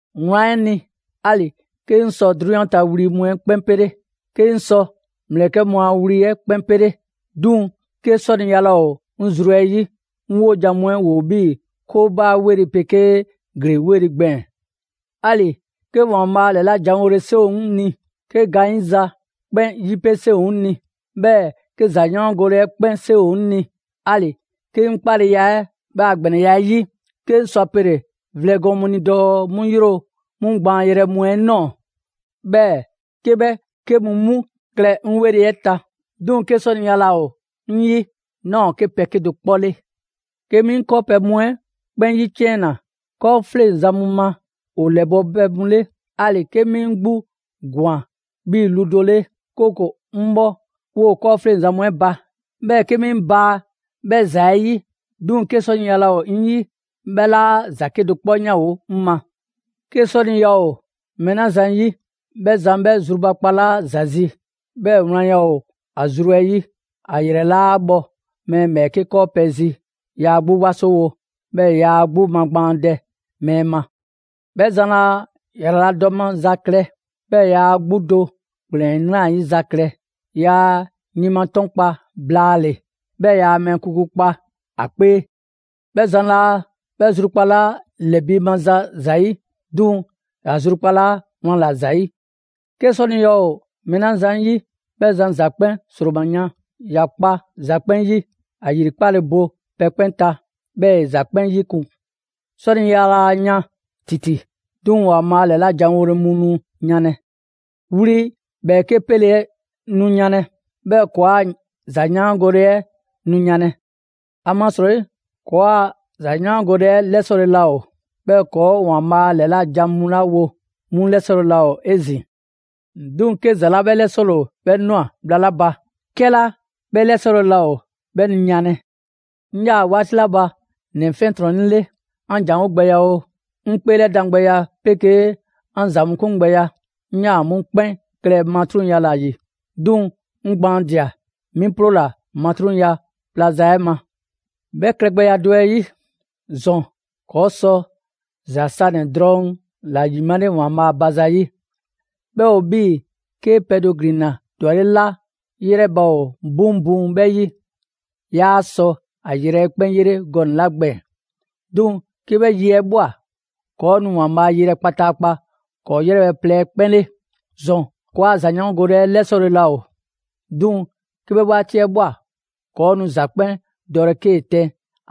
Wlan 'ɛ ni, 'ali‑ 'ke 'ŋ sɔ 'drunyan ta wli mu 'ɛ 'kpɛn 'pele, 'ke 'ŋ sɔ ‑mlɛkɛ' mu a wli mu 'ɛ 'kpɛn 'pele, 'duŋ‑ 'ke 'sɔniya laa ‑o 'ŋ zru 'ɛ 'yi, 'ŋ 'wojan‑ mu 'ɛ ‑woo 'bhii‑ 'koobaa‑ 'weli‑ 'pegee ‑glee 'weli‑ gbɛɛn‑. 'Ali‑ 'ke ‑Waanbhaa' ‑lɛlajanwole 'seŋ ‑o 'ŋ ni, 'ke gaanyiza 'kpɛn ‑yipe' 'seŋ ‑o 'ŋ ni, 'bhɛɛ‑ 'ke ‑zayaangole 'ɛ 'kpɛn 'seŋ ‑o 'ŋ ni; 'ali‑ 'ke 'ŋ 'kpaleya 'ɛ 'bhɛ a ‑gbɛnɛya 'ɛ 'yi, 'ke 'ŋ sɔ a pele‑ vlɛ gɔɔn mu ni dɔɔ 'mu 'yro 'mu gbaanyrɛ mu 'ɛ ꞊nɔɔ, 'bhɛɛ‑ 'ke 'bhɛ 'ke mu 'mu klɛ 'ŋ 'weli‑ ta; 'duŋ‑ 'ke 'sɔniya laa ‑o 'ŋ 'yi, 'naa ‑o 'ke pɛ 'kedo‑ 'kpɔ 'le. 'Ke 'mi 'ŋ 'kɔɔpɛ‑ mu 'ɛ 'kpɛn 'yiciɛnna 'kɔɔfleŋzan mu ma ‑o ‑lɛbɔ' pɛ mu 'le, 'ali‑ 'ke 'mi 'ŋ 'gbu ꞊gwan 'bhii‑ lu do 'le, 'kooko‑ 'ŋ bhɔ 'woo‑ 'kɔɔfleŋzan mu 'ɛ ba, 'bhɛɛ‑ 'ke 'mi 'ŋ baa 'bhɛ ‑za 'ɛ 'yi, 'duŋ‑ 'ke 'sɔniya laa ‑o 'ŋ 'yi, 'bhɛ 'laa ‑za 'kedo‑ 'kpɔ 'yanwo‑ 'ŋ ma. 'Ke 'sɔniya ‑o mɛɛ 'la zan ‑yi, 'bhɛ zan 'bhɛ zrubakpalaa ‑za zi, 'bhɛɛ‑ wlanya ‑o ‑a zru 'ɛ 'yi, ‑a ‑yrɛ 'laa bhɔ mɛɛ ‑bhɛɛke' 'kɔɔpɛ‑ zi, yaa 'gbu 'wasowo, 'bhɛɛ‑ yaa ‑a 'gbu magbaandɛ mɛɛ ma. 'Bhɛ zan laa ‑yraladɔ maza klɛ, yaa ‑a 'gbu do ‑kplɛn 'nrayiza klɛ, yaa ‑a yinmatɔnkpa blaale‑, 'bhɛɛ‑ yaa mɛɛ kuku kpa ‑a 'kpee. 'Bhɛ zan laa 'bhɛ zrukpalaa ‑lɛbiimaza zayi'; 'duŋ‑ ‑ya zrukpalaa wlan ‑la ‑zayi'. 'Ke 'sɔniya ‑o mɛɛ 'la zan 'yi, 'bhɛ zan ‑za 'kpɛn 'sroma‑ yan, ‑ya kpa ‑za 'kpɛn 'yi, ‑a ‑yri 'kpale‑ bo pɛ 'kpɛn ta, 'bhɛɛ‑ ‑e ‑za 'kpɛn 'yikun‑. 'Sɔniya laa yan ‑titi. 'Duŋ‑ ‑Waanbhaa' ‑lɛlajanwole mu nu yanlɛ. Wli ‑bhɛɛke' 'pele 'ɛ nu yanlɛ; 'bhɛɛ‑ ‑kɔɔa' ‑zayaangole 'ɛ nu yanlɛ. ‑Amasrɔyi ‑kɔɔa' ‑zayaangole 'ɛ 'lɛsɔle laa ‑o, 'bhɛɛ‑ ‑kɔɔ' ‑Waanbhaa' ‑lɛla' jan mu 'la wo, 'mu 'lɛsɔle laa ‑o 'ezin‑. 'Duŋ‑, 'ke ‑za 'la 'bhɛ 'lɛsɔle ‑o, 'bhɛ ꞊nwa bhla 'la ba, 'kɛla 'bhɛ 'lɛsɔle laa ‑o, 'bhɛ nu yanlɛ. 'Ŋ 'yaa‑ 'waati 'la ba ‑nɛ 'fiɛntrɔnnɛ 'le, 'an ‑janwo' gbɛya oo, 'ŋ 'kpeelɛdan gbɛya 'pegee 'an ‑za 'kun gbɛya, 'ŋ 'yaa‑ 'mu 'kpɛn klɛ matruŋya ‑la ‑yi. 'Duŋ‑ 'ŋ gbaanladia, 'mi 'ploola‑ matruŋya pla za 'ɛ ma. 'Bhɛ klɛgbɛya do 'ɛ 'yi, ‑zɔn ‑kɔɔ' sɔ ‑za sanɛ‑ drɔŋ 'la ‑yimale ‑Waanbhaa' ba zayi', 'bhɛ ‑o 'bhii‑ 'kee‑ pɛ do ‑glinna ‑dwaleŋ' 'la 'yrɛba‑ ‑o 'buŋbuŋ 'bhɛ 'yi, 'yaa‑ sɔ ‑a yrɛ 'ɛ 'kpɛn 'yele gɔnɛ‑ 'la gbɛɛn‑. 'Duŋ‑ 'ke 'bhɛ yi 'ɛ ꞊bhwa, ‑kɔɔ' nu ‑Waanbhaa' yelɛ kpataakpa ‑kɔɔ' 'yrɛbhɛ‑ plɛ 'ɛ 'kpɛn 'le. ‑Zɔn ‑kɔɔa' ‑zayaangole 'ɛ 'lɛsɔle laa ‑o; 'duŋ‑ 'ke 'bhɛ 'waati 'ɛ ꞊bhwa, ‑kɔɔ' nu ‑za 'kpɛn dɔlɛ 'kee‑ tɛn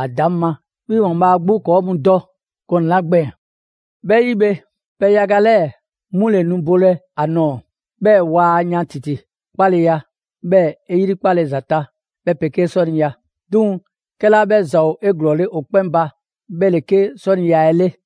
‑a ‑daŋ' ma, 'bhii‑ ‑Waanbhaa' 'gbu ‑kɔɔ' mu dɔ gɔnɛ‑ 'la gbɛɛn‑. 'Bhɛ 'yi bhe, pɛ yaga 'lɛɛ‑ 'mu ‑le nu bolɛ ‑a nɔɔ‑; 'bhɛɛ‑ waa yan ‑titi: 'kpaleya, 'bhɛɛ‑ 'e 'yrikpale ‑za ta, 'bhɛ 'pegee 'sɔniya. 'Duŋ‑ 'kɛla 'bhɛ ‑za ‑o 'eglɔɔle ‑o 'kpɛn ba 'bhɛ ‑le 'ke 'sɔniya 'ɛ 'le.